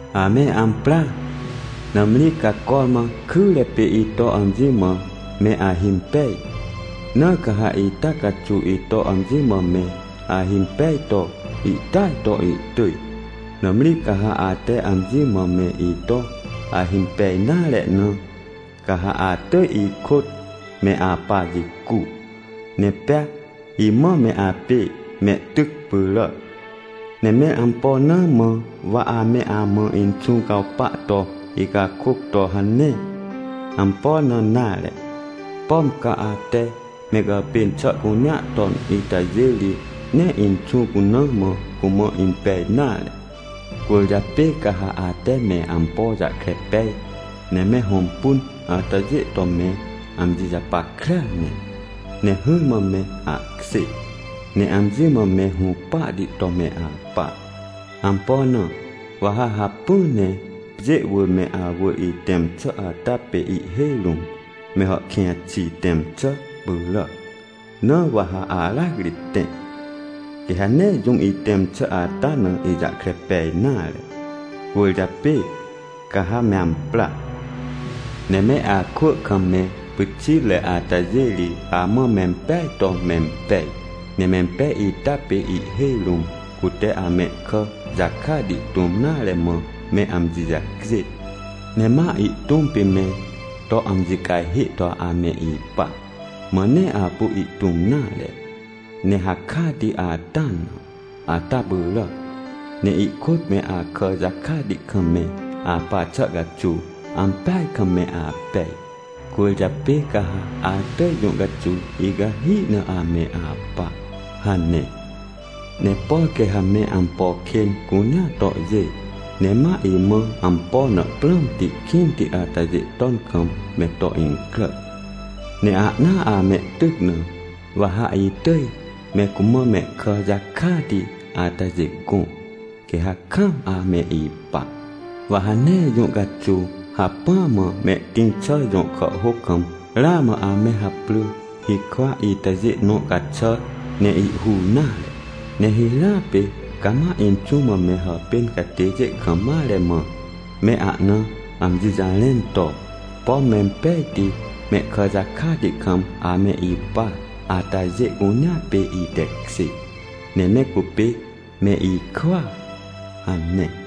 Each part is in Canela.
Ame ampra! Nãmri ca cormã kyre pê ito amji mã me ahimpej, na ca ha ita caxuw ito amji mã me ahimpej to ihtỳaj to ihtỳj. Nãmri ca ha ate amji mã me ito ahimpej nare na, ca ha atỳj ikôt me apa jicu, ne pea imã me apê mehtyc pyràac. Ne mẽr ampo na mã wa ame amã Inxũ cawpa to icakôc to hane? Ampo na nare. Pom ca ate me gàpên xà cunea ton itajê ri, nee Inxũ cuna mã cumã impej nare. “Cwỳrjapê ca ha ate me ampo jahkre pej, ne me hõmpun atajê to me amji japackrea ne, ne hỹrmã me apkjê, ne amji mã me hũpahti to me apa. Ampo na? Wa ha hacpỹ ne pjê wỳr me awỳr itẽm xà ata pê ihhêj rũm me hàhkĩj xi tẽm xà pyràac, na wa ha aracri tẽ. Quê ha nee jũm itẽm xà ata na ijahkre pej nare. Cwỳrjapê ca ha me ampra! “Ne me akwỳ kam me pyxitre atajê ri amã mempeaj to mempej. Ne mempej ita pê ihhêj rũm cute amehkà jakati tũm nare mã me amji jacjên, ne ma ihtũm pê me to amji cajhê to ame ipa, mã nee apu ihtũm nare, ne hakati ata na, ata pyràac. Ne ikôt me akà jakati kam me apa xà caxuw, ampeaj kam me apej, cwỳrjapê ca ha atỳj jũ caxuw icahi na ame apa” hane. — “Ne por quê ha me ampo kên cunea tohjê, ne ma imã ampo na prãmti kĩnti atajê ton kam me to incrà, ne ahnaa amehtyc na, wa ha itỳj me cumã mehkà jakati atajê gõ, quê ha kaam ame ipa. Wa ha nee jũ caxuw hacpỹa mã mehtĩr xà jõ kàhhôc kam ramã ame haprỳ hikwa itajê nõ caxàr ne ihhur nare. Ne hirãa pê cama Inxũ mã me hàpên catêjê kam mare mã, me ahna amji jarẽn to, ‘Pom mempejti mehkà jakati kam ame ipa atajê cunea pê itekjê, ne me cupê me ikwỳa’ hane.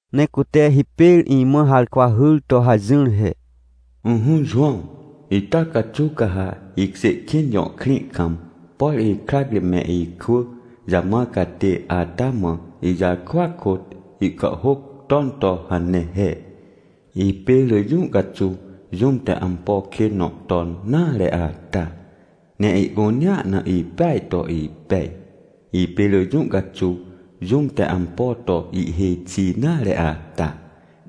Ne cute hipêr imã harkwa hyr to hajỹr he: — Ỹhỹ Jowãw, ita caxuw ca ha Ihkjêkĩn jõ krĩ kam, por ikrac ri me ikwỳ jamãr catê ata mã ijarkwa kôt ihkàhhôc ton to hane he: — “Ipê rỳ jũ caxuw jũm te ampo kên nõ ton nare ata, ne ihcunea na ipeaj to ipej. Ipê rỳ jũ caxuw jũm te ampo to ihhêj xi nare ata,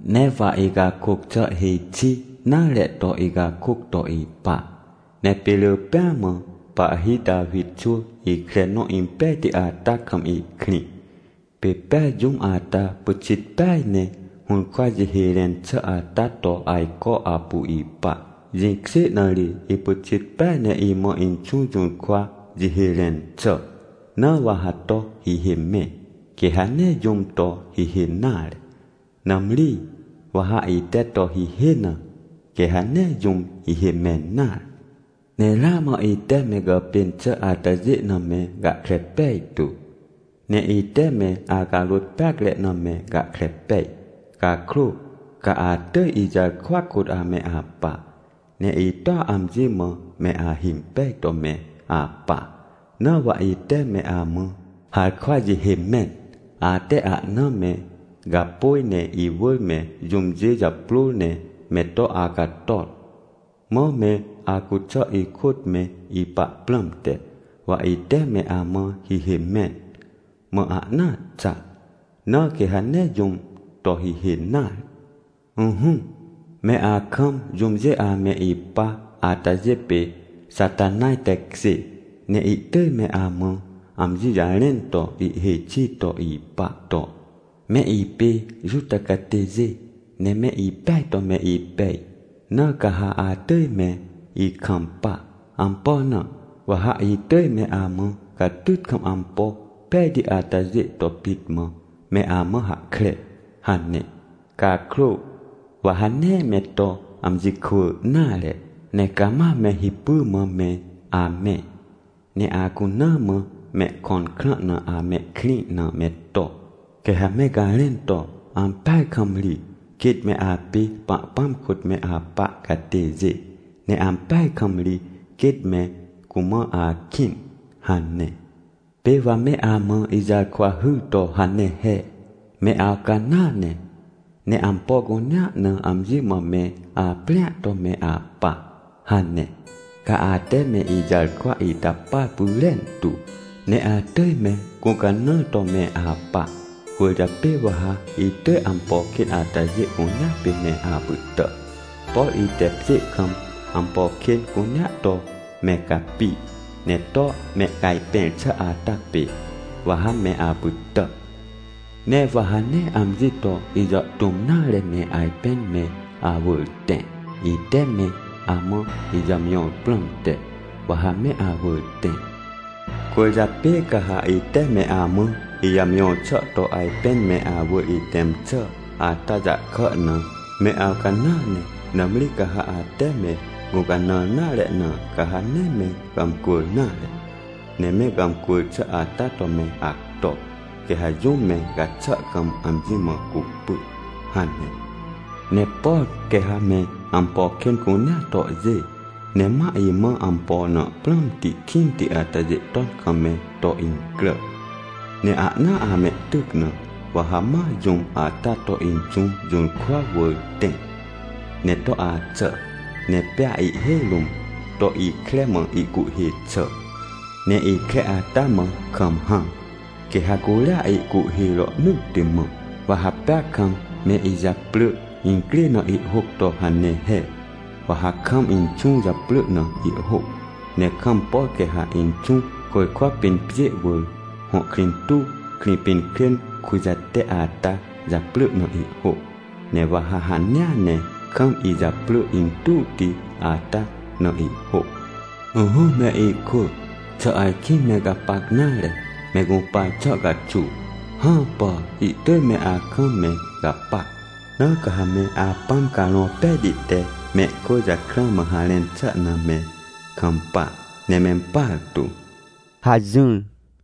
ne wa icakôc xà hêj xi nare to icakôc to ipa. Ne pê rỳ pêa mã pahhi Tawi xwỳ ikre nõ impejti ata kam ihkrĩ. Pê pea jũm ata pyxit peaj ne hũrkwa jihê rẽn xà ata to ajco apu ipa. Jĩkjê na ri ipyxit peaj ne imã Inxũ jũrkwa jihê rẽn xà. Na wa ha to hihê mẽ, quê ha nee jũm to hihê nare. Nãmri, wa ha ite to hihê na, quê ha nee jũm hihê mẽn nare. Ne ramã ite me gàpên xà atajê na me gahkre pejtu, ne ite me acarôt peacre na me gahkre pej. Cakrô ca atỳj ijarkwa kôt ame apa, ne itoa amji mã me ahimpej to me apa. Na wa ite me amã harkwa jihê mẽn, ate ahna me gapôj ne iwỳr me jũmjê japrôr ne me to acator, mã me acuxà ikôt me ipa prãmte. Wa ite me amã hihê mẽn, mã ahnaa xa, na quê ha nee jũm to hihê nare. “Ỹhỹ, me akam jũmjê ame ipa atajê pê Xatanaj tekjê. Ne ihtỳj me amã amji jarẽn to ihhêj xi to ipa to, ‘Me ipê Juta catêjê, ne me ipeaj to me ipej, na ca ha atỳj me ikampa. Ampo na? Wa ha itỳj me amã catyt kam ampo pejti atajê to pit mã me amã hahkre’ hane. Cakrô, wa ha nee me to amji kwỳ nare. Ne cama me hipy mã me amẽ. Ne acuna mã, mehkõn krã na amehkrĩ na me to, quê ha me garẽn to, ‘Ampeaj kam ri, quêt me apê Pahpãm kôt me apa catêjê, ne ampeaj kam ri quêt me cumã akĩn!’ hane. “Pê wa me amã ijarkwa hyr to hane he: ‘Me awcanãa ne, ne ampo cunea na amji mã me aprĩa to me apa’ hane. Ca ate me ijarkwa ita par pyrentu, ne atỳj me gũcanãr to me apa. Cwỳrjapê wa ha itỳj ampo kên atajê cunea pê me apytà. Por ite pjê kam ampo kên cunea to me capi ne to mehcajpẽr xà ata pê, wa ha me apytà. Ne wa ha nee amji to ijàhtũm nare ne ajpên me awỳr tẽ. Ite me amã ijàmjõr prãmte, wa ha me awỳr tẽ. Cwỳrjapê ca ha ite me amã ijàmjõr xà to ajpên me awỳr itẽm xà ata jahkà na me awcanãa ne. Nãmri ca ha ate me gũcanãr nare na, ca ha nee me gàmcwỳr nare, ne me gàmcwỳr xà ata to me acto, quê ha jũm me gaxà kam amji mã cupy” hane. — Ne por quê ha me ampo kên cunea tohjê, ne ma imã ampo na prãmti kĩnti atajê ton kam me to incrà ne ahnaa amehtyc na, wa ha ma jũm ata to Inxũ jũrkwa wỳr tẽ, ne to axà, ne pea ihhêj rũm to ikre mã ihcuhhê xà, ne ikre ata mã kam hãm. Quê ha curia ihcuhhê rohnỳtti mã. Wa ha pea kam me ijaprỳ incrê na ihhôc to hane he. Wa ha kam Inxũ japrỳ na ihhôc, ne kam, por quê ha Inxũ, côjkwa pĩn pjê wỳr, hõ krĩ tuw Krĩpinkrên kujate ata japrỳ na ihhôc. Ne wa ha hanea ne kam ijaprỳ intuwti ata na ihhôc. — Ỹhỹ me ikwỳ, xà ajkĩ me gapac nare me gũpar xà caxuw? Hãpà! Ihtỳj me akam me gapac, na ca ha me Apãm Carõ Pejti te mehkwỳ jakrã mã harẽn xà na me kampa ne mempartu — hajỹr.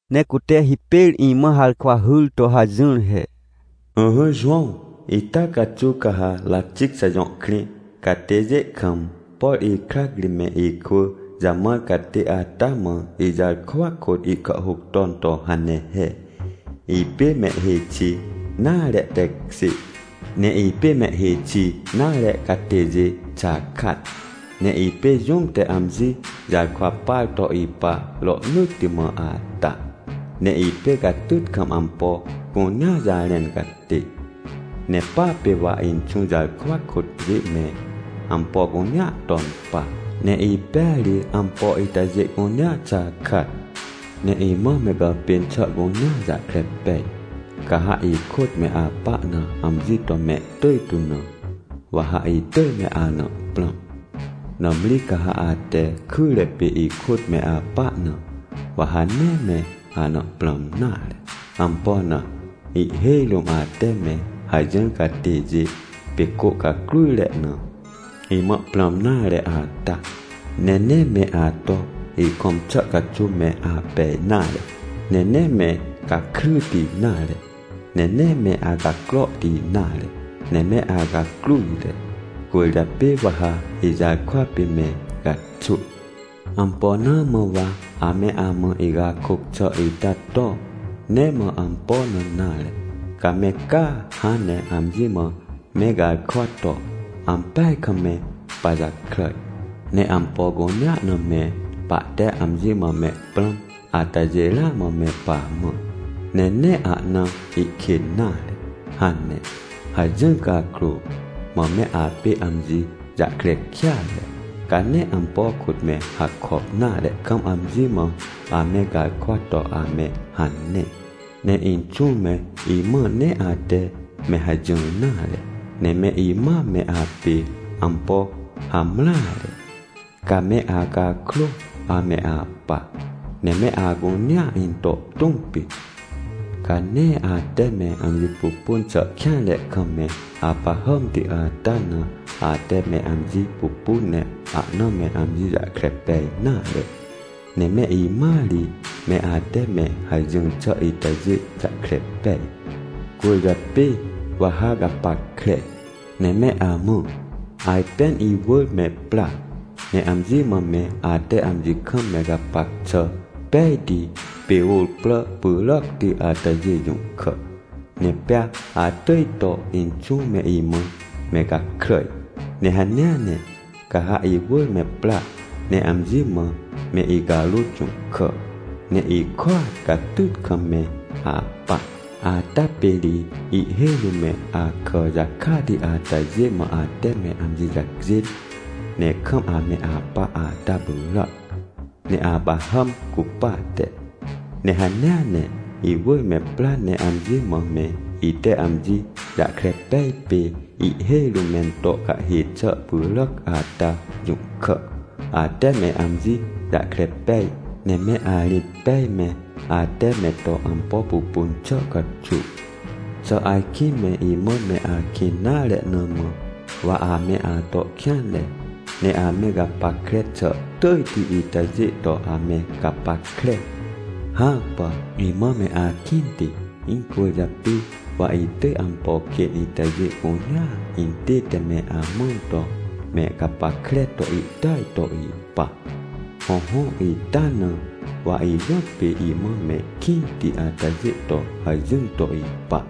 Ne cute hipêr imã harkwa hyr to hajỹr he: — Ỹhỹ Jowãw, ita caxuw ca ha Ratixa jõ krĩ catêjê kam, por ikrac ri me ikwỳ jamãr catê ata mã ijarkwa kôt ihkàhhôc ton to hane he. — “Ipê mehhêj xi nare tekjê, ne ipê mehhêj xi nare catêjê xakat, ne ipê jũm te amji jarkwa par to ipa rohnỳtti mã ata, ne ipê catyt kam ampo cunea jarẽn catê. Ne pa pê wa Inxũ jarkwa kôt pjê me ampo cunea ton pa, ne ipêa ri ampo itajê cunea xakat. Ne imã me gàpên xà cunea jahkre pej. Ca ha ikôt me apa na amji to mehtỳj tu na, wa ha itỳj me ana prãm. Nãmri ca ha ate kyre pê ikôt me apa na, wa ha nee me ana prãm nare. Ampo na? Ihhêj rũm ate me hajỹr catêjê pê cô cacrujre na, imã prãm nare ata. Ne nee me ato ikõm xà caxuw me apej nare, ne nee me gakryti nare, ne nee me acacrohti nare, ne me acacrujre. Cwỳrjapê wa ha ijarkwa pê me gaxwỳ. “Ampo na mã wa ame amã icakôc xà ita to? Nee mã ampo na nare, ca me caa hãn ne amji mã me garkwa to, ‘Ampeaj kam me pajakràj! Ne ampo cunea na me pahte amji mã me prãm atajê ramã me pamã! Ne nee ahna ihkên nare!’ hane. Hajỹr cakrô, mã me apê amji jahkre kêatre, ca nee ampo kôt me hakop nare kam amji mã ame garkwa to ame hane. Ne Inxũ me imã nee ate me hajỹr nare! Ne me imã me apê ampo hamreare, ca me acakrô ame apa, ne me acunea into tũm pit. Ca nee ate me amji pupun xà kêanre kam me apahàmti ata na, ate me amji pupun ne ahna me amji jahkre pej nare, ne me imãa ri me ate me hajỹr xà itajê jahkre pej. “Cwỳrjapê wa ha gapackre, ne me amã. Ajpên iwỳr me pra, ne amji mã me ate amji kam me gapac xà pejti pê ôr prà pyràcti atajê jũhkà, ne pea atỳj to Inxũ me imã me gakràj. Ne hanea ne, ca ha iwỳr me pra ne amji mã me icarôt jũhkà, ne ihkôat catyt kam me apa, ata pê ri ihhêj rũm me akà jakati atajê mã ate me amji jacjên, ne kam ame apa ata pyràac, me apahàm cupate. Ne hanea ne iwỳr me pra ne amji mã me ite amji jahkre pej pê ihhêj rũm mento cahhê xà pyràac ata jũhkà, ate me amji jahkre pej, ne me arĩt pej me ate me to ampo pupun xà caxuw. “Xà ajkĩ me imã me akĩn nare na mã wa ame ato kêanre, ne ame gapackre xà tỳjti itajê to ame gapackre? Hãpà! Imã me akĩnti, incwỳrjapê wa itỳj ampo kên itajê cunea intête me amãn to me gapackre to ihtỳaj to ipa. Hõhõ, ita na wa ijõtpê imã mehkĩnti atajê to hajỹr to ipa.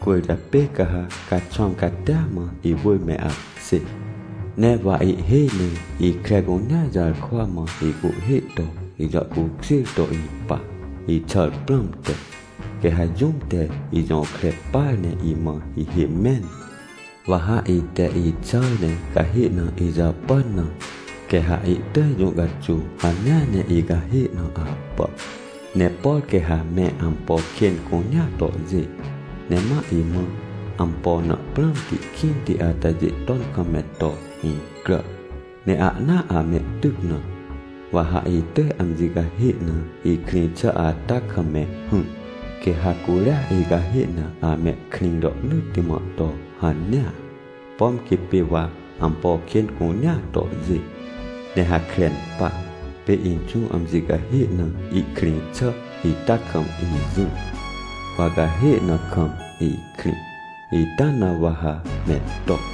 Cwỳrjapê ca ha caxwãm catia mã iwỳr me apkjê. Ne wa ihhêj ne ikre cunea jarkwa mã icuhhê to ijàhcukjêr to ipa, ixàr prãmte. Quê ha jũm te ijõkre par, ne imã hihê mẽn, wa ha ite ixàr ne cahê na ijàpàn na, quê ha ihtỳj jũ caxuw hanea ne icahê na apà. “Ne por quê ha me ampo kên cunea tohjê, ne ma imã ampo na prãmti kĩnti atajê ton kam me to incrà, ne ahnaa amehtyc na, wa ha itỳj amji cahê na ikrĩ xà ata kam me hỹr. Quê ha curia icahê na amehkrĩ rohnỳtti mã to hanea, pom quê pê wa ampo kên cunea tohjê ne hakren pa, pê Inxũ amji cahê na ihkrĩ xà ita kam ijỹr, wa cahê na kam ikrĩ, ita na wa ha me to.